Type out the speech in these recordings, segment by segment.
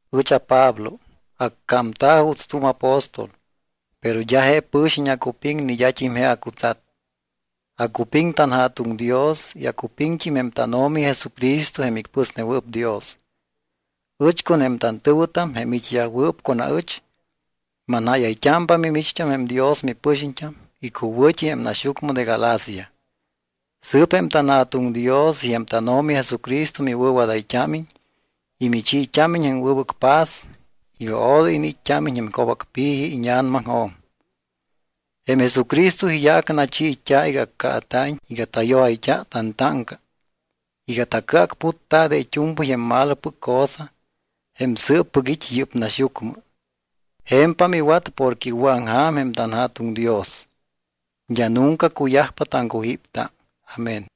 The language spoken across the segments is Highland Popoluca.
Ɨch aPablo. Accámta̱ juuts tu̱m apóstol. Pero d́a je pɨxiñt́am acupiŋ ni d́at́im je acutsat. Acupiŋ tanJa̱tuŋ Dios y acupiŋt́im jém tánO̱mi Jesucristo jém icpɨsnewɨɨp Dios. Ɨch con jém tantɨ̱wɨtam, jém it́yajwɨɨp con aɨch, manjáyayt́ámpa mimicht́am jém Dios mipɨxiñt́am icuwɨ̱t́i jém naxyucmɨ de Galacia. Sɨɨp jém tanJa̱tuŋ Dios y jém tánO̱mi Jesucristo miwɨ̱wadayt́ámiñ y michiit́ámiñ jém wɨbɨc paz iga odoy iniit́t́ámiñ jém co̱bacpi̱ji íña̱namaŋjo̱m. Jém Jesucristo iyaac nachiit́a̱ iga accaata̱iñ iga tayojayt́a tantáŋca iga tacɨacputta de it́u̱mpɨy jém malopɨc cosa jém sɨɨppɨc it́ yɨ́p naxyucmɨ. Je̱mpam iwat porque iwɨ̱aŋja̱m jém tanJa̱tuŋ Dios. D́a nunca cuyajpa taŋcujípta. Amén.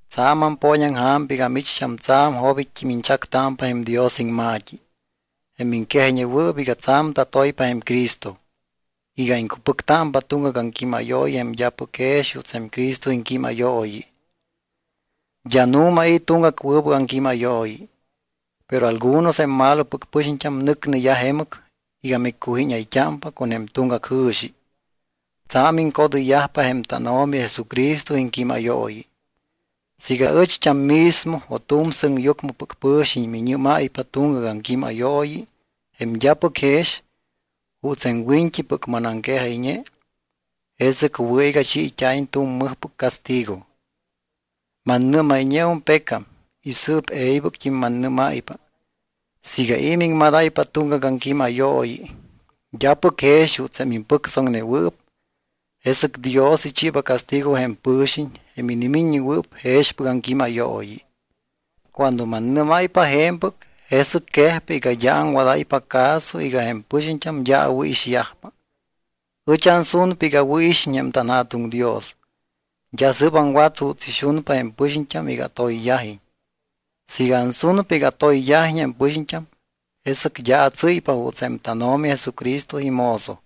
Tsa̱m ampooñaŋja̱mpa iga micht́am tsa̱m jobit́t́im iñchactámpa jém Dios iŋma̱t́i, jém miŋquejayñewɨɨp iga tsa̱m tatoypa jém Cristo, iga iŋcupɨctámpa tuŋgac aŋquímayooyi jém d́apɨc jex juuts jém Cristo iŋquímayooyi. D́a nu̱ma i̱ tuŋgac wɨbɨc aŋquímayooyi. Pero algunos jém malopɨc pɨxiñt́am nɨcneyaj jemɨc iga miccujíñayt́ámpa con jém tuŋgac jɨ̱xi, tsa̱m iŋcodɨyyajpa jém tánO̱mi Jesucristo iŋquímayooyi. Siiga aɨcht́am mismo o tu̱m sɨŋyucmɨpɨc pɨ̱xiñ minimíñáypa tuŋgac aŋquímayooyi jém d́apɨc jex juuts jém wiñt́ipɨc manaŋquejayñe, jesɨc wɨ̱ iga chiit́a̱iñ tu̱m mɨjpɨc castigo. Mannɨ́mayñeum pecam y sɨɨp e̱ybɨct́im mannɨ́máypa siiga i̱ miŋmadáypa tuŋgac aŋquímayooyi, d́apɨc jex juuts jém impɨctsoŋnewɨɨp, jesɨc Dios ichiiba castigo jém pɨ̱xiñ jém inimiññewɨɨp jexpɨc aŋquímayooyi. Cuando mannɨ́máypa je̱mpɨc, jesɨc quejpa iga d́a aŋwadáypa caso iga jém pɨxiñt́am d́a awɨ̱ixyajpa. Ɨch ansunpa iga awɨ̱ixiñ jém tanJa̱tuŋ Dios. D́a sɨ́p aŋwat juuts ixunpa jém pɨxiñt́am iga atoyyajiñ. Siiga ansunpa iga atoyyajiñ jém pɨxiñt́am, jesɨc d́a atsɨ́ypa juuts jém tánO̱mi Jesucristo imozo.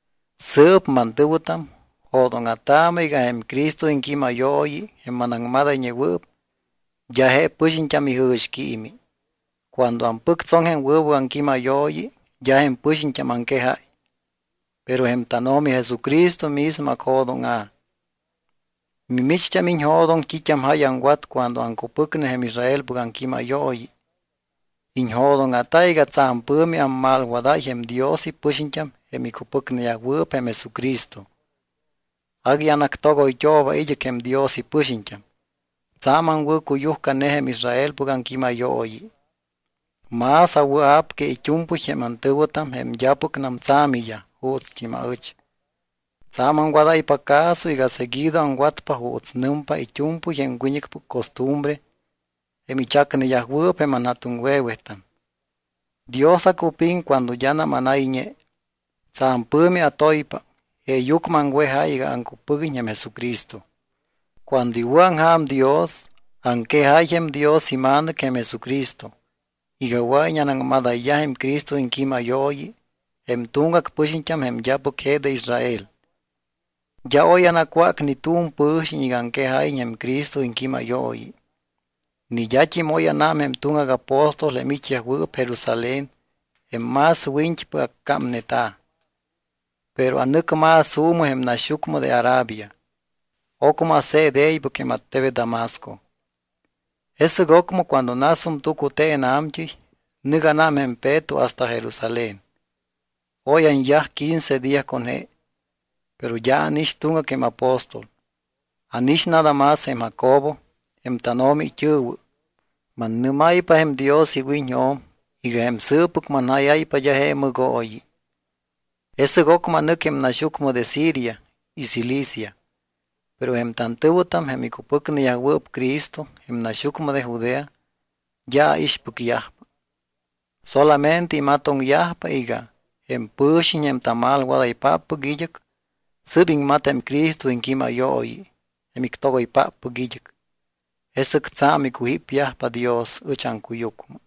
Sɨɨp, mantɨ̱wɨtam, jo̱dóŋa̱taamɨ iga jém Cristo iŋquímayooyi, jém manaŋmadayñewɨɨp, d́a je pɨxiñt́am ijɨ̱xquiimi. Cuando ampɨctsoŋ jém wɨbɨc aŋquímayooyi, d́a jém pɨxiñt́am aŋquejáy, pero jém tánO̱mi Jesucristo mismo acjo̱dóŋa̱. Mimicht́am iñjo̱doŋ t́it́am jáy aŋwat cuando aŋcupɨcne jém Israelpɨc aŋquímayooyi. Iñjo̱dóŋa̱ta iga tsa̱m pɨ̱mi ammalwadáy jém Dios ipɨxiñt́am jém icupɨcneyajwɨɨp jém Jesucristo. Agui anactogoyt́ooba id́ɨc jém Dios ipɨxiñt́am. Tsa̱m aŋwɨ̱cuyujcane jém Israelpɨc aŋquímayooyi. Más awɨa̱p que it́u̱mpɨy jém antɨ̱wɨtam jém d́apɨcnam tsa̱miyaj juutst́im aɨch. Tsa̱m aŋwadáypa caso iga seguido aŋwatpa juuts nɨmpa it́u̱mpɨy jém wiñɨcpɨc costumbre jém ichacneyajwɨɨp jém anja̱tuŋwe̱wetam. Dios acupiŋ cuando d́anam anayñe. Tsa̱m pɨ̱mi atoypa jeeyucmɨ aŋwejáy iga aŋcupɨguiñ jém Jesucristo. Cuando iwɨ̱aŋja̱m Dios, aŋquejáy jém Dios iMa̱nɨc, jém Jesucristo, iga wɨa̱iñ anaŋmadayyaj jém Cristo iŋquímayooyi jém tuŋgac pɨxiñt́am jém d́apɨc je de Israel. D́a oy anacwác ni tu̱m pɨ̱xiñ iga aŋquejáyiñ jém Cristo iŋquímayooyi. Ni d́at́im oy ánám jém tuŋgac apóstol jém it́yajwɨɨp Jerusalén jém más wiñt́ipɨc accámneta̱. Pero anɨc más juumɨ jém naxyucmɨ de Arabia. Ocmɨ ase̱t e̱ybɨc jém attebet Damasco. Jesɨc ocmɨ cuando nasum tucute̱n a̱mt́ɨy, nɨc ánám jém Peto hasta Jerusalén. Oy anyaj quince día con je. Pero d́a ánix tuŋgac jém apóstol. Ánix nada más jém Jacobo, jém tánO̱mi it́ɨ̱wɨ. Mannɨ́máypa jém Dios iwiñjo̱m iga jém sɨɨppɨc manjáyáypa d́a je mɨgooyi. Jesɨc ocmɨ anɨc jém naxyucmɨ de Siria y Cilicia. Pero jém tantɨ̱wɨtam, jém icupɨcneyajwɨɨp Cristo jém naxyucmɨ de Judea, d́a aixpɨcyajpa. Solamente imatoŋyajpa iga: “Jém pɨxiñ jém tamalwadaypáppɨc id́ɨc, sɨ́p iŋmat jém Cristo iŋquímayooyi jém ictogoypáppɨc id́ɨc.” Jesɨc tsa̱m icujípyajpa Dios ɨch aŋcuyucmɨ.